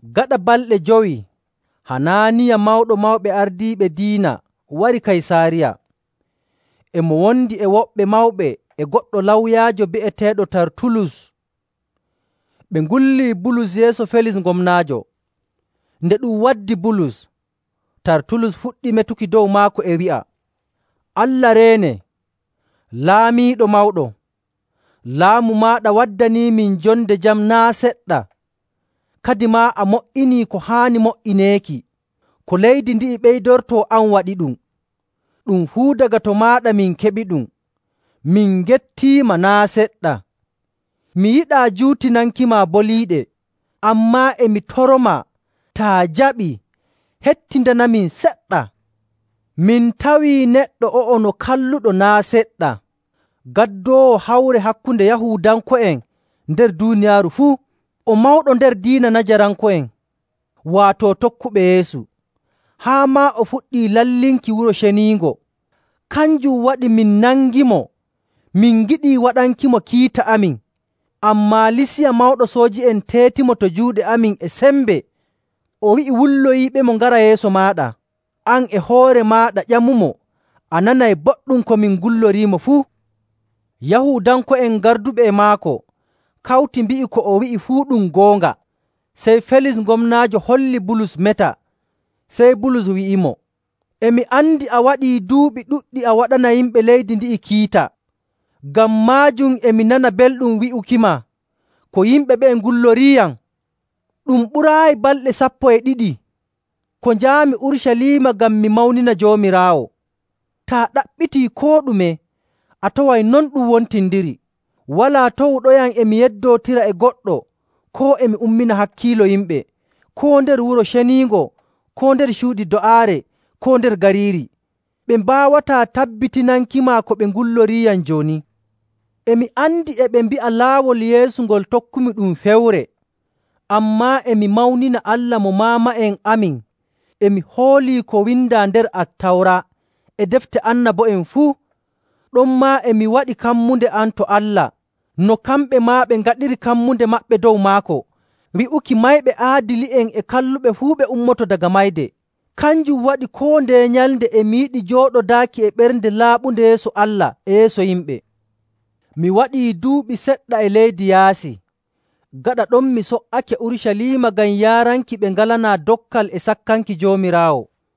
Gaɗa balɗe jowi, Hanaaniya, Mawɗo Mawɓe Ardiiɓe Diina, wari Kaysaariya. E mo wondi e woɓɓe mawɓe e goɗɗo lawyaajo bi'eteeɗo Tartulus. Ɓe ngullii Bulus yeeso Felis gomnaajo. Nde ɗum waddi Bulus, Tartulus fuɗɗi metuki dow maako e wi'a, “Allah reene, laamiiɗo mawɗo! Laamu maaɗa waddaniimin jonde jam naa' seɗɗa, kadimaa a mo''inii ko haani mo''ineeki, ko leydi ndi'i ɓeydortoo, an waɗiɗum. Ɗum fuu daga to maaɗa min keɓiɗum, min ngettiima naa' seɗɗa. Mi yiɗaa juutinankima boliiɗe, ammaa e mi toromaa taa jaɓii hettindanamin seɗɗa. Min tawii neɗɗo o'o no kalluɗo naa' seɗɗa, gaddoowo hawre hakkunde Yahuudanko'en nder duuniyaaru fuu. O mawɗo nder diina Najaranko'en, waato tokkuɓe Yeesu. Haa maa o fuɗɗii lallinki Wuro Ceniingo, kanjum waɗi min nangimo. [Min ngiɗii waɗankimo kiita amin, ammaa Lisiya mawɗo sooji'en teetimo to juuɗe amin e sembe, o wi'i wulloyiiɓemo ngara yeeso maaɗa.] An e hoore maaɗa, ƴamumo, a nanay boɗɗum ko min ngulloriimo fuu.” Yahuudanko'en garduɓe e maako kawti mbi'i ko o wi'i fuu ɗum goonga. Sey Felis gomnaajo holli Bulus meta, sey Bulus wi'imo, “E mi andi a waɗii duuɓi ɗuɗɗi a waɗana yimɓe leydi ndi'i kiita. Ngam maajum e mi nana belɗum wi'ukima ko yimɓe ɓe'e ngulloriiyam. Ɗum ɓuraayi balɗe sappo e ɗiɗi ko njaami Urucaliima ngam mi mawnina Joomiraawo. Taa ɗaɓɓitii koo ɗume, a taway non ɗum wontindiri. Walaa tawuɗoyam e mi yeddootira e goɗɗo koo e mi ummina hakkiilo yimɓe, koo nder Wuro Ceniingo, koo nder cuuɗi do'aare, koo nder gariiri. Ɓe mbaawataa tabbitinankima ko ɓe ngulloriiyam jooni. E mi andi e ɓe mbi'a Laawol Yeesu ngol tokkumi ɗum fewre, ammaa e mi mawnina Allah mo maama'en amin, e mi hoolii ko windaa nder Attawra e defte annabo'en fuu. Ɗonmaa e mi waɗi kammunde am to Allah, no kamɓe maa ɓe ngaɗiri kammunde maɓɓe dow maako, wi'uki mayɓe aadili'en e kalluɓe fuu ɓe ummoto daga mayde. Kanjum waɗi koo ndeye nyalnde e mi yiɗi jooɗodaaki e ɓernde laaɓunde yeeso Allah e yeeso yimɓe. “Mi waɗii duuɓi seɗɗa e leyɗe yaasi. Gaɗa ɗon mi so''ake Urucaliima ngam yaaranki ɓe ngalanaa dokkal e sakkanki Joomiraawo.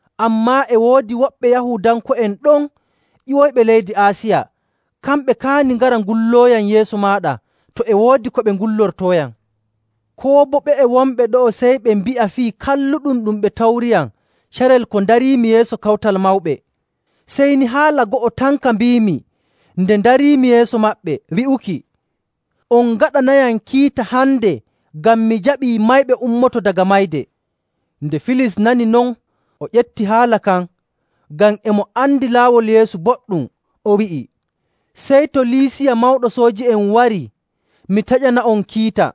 Ammaa e woodi woɓɓe Yahuudanko'en ɗon ƴiwoyɓe leydi Aasiya, kamɓe kaani ngara ngullooyam yeeso maaɗa, to e woodi ko ɓe ngullortooyam. Koo boo ɓe'e wonɓe ɗo'o sey ɓe mbi'a fii kalluɗum ɗum ɓe tawriyam carel ko ndariimi yeeso Kawtal Mawɓe, sey ni haala ngo'ota tan ka mbiimi nde ndariimi yeeso maɓɓe, wi'uki, ‘On ngaɗanayam kiita hande ngam mi jaɓii mayɓe ummoto daga mayde!’”. Nde Felis nani non o ƴefti haala kan, ngam e mo andi Laawol Yeesu boɗɗum. O wi'i, “Sey to Lisiya mawɗo sooji'en warii, mi taƴana'on kiita.”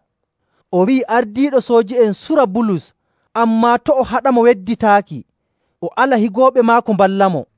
O wi'i ardiiɗo sooji'en sura Bulus, ammaa to' o haɗamo wedditaaki, o ala higooɓe maako mballamo.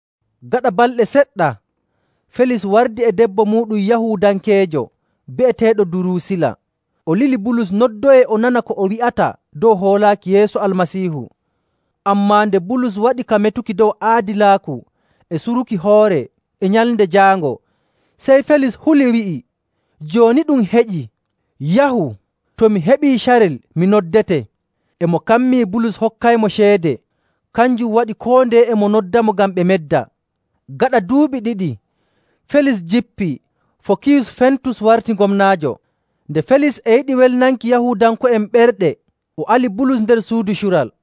Gaɗa balɗe seɗɗa Felis wardi e debbo muuɗum, Yahuudankeejo bi'eteeɗo Duruusila. O lili Bulus noddoyee o nana ko o wi'ata dow hoolaaki Yeesu Almasiihu. Ammaa nde Bulus waɗi ka metuki dow aadilaaku e suruki hoore e Nyalnde Jaango, sey Felis huli, wi'i, “Jooni ɗum heƴii. Yahu! To mi heɓii carel, mi noddete.” E mo kammii Bulus hokkaymo ceede. Kanjum waɗi koo ndeye e mo noddamo ngam ɓe medda. Gaɗa duuɓi ɗiɗi, Felis jippii, Fokiyus Festus warti gomnaajo. Nde Felis e yiɗi welnanki Yahuudanko'en ɓerɗe, o ali Bulus nder suudu cural.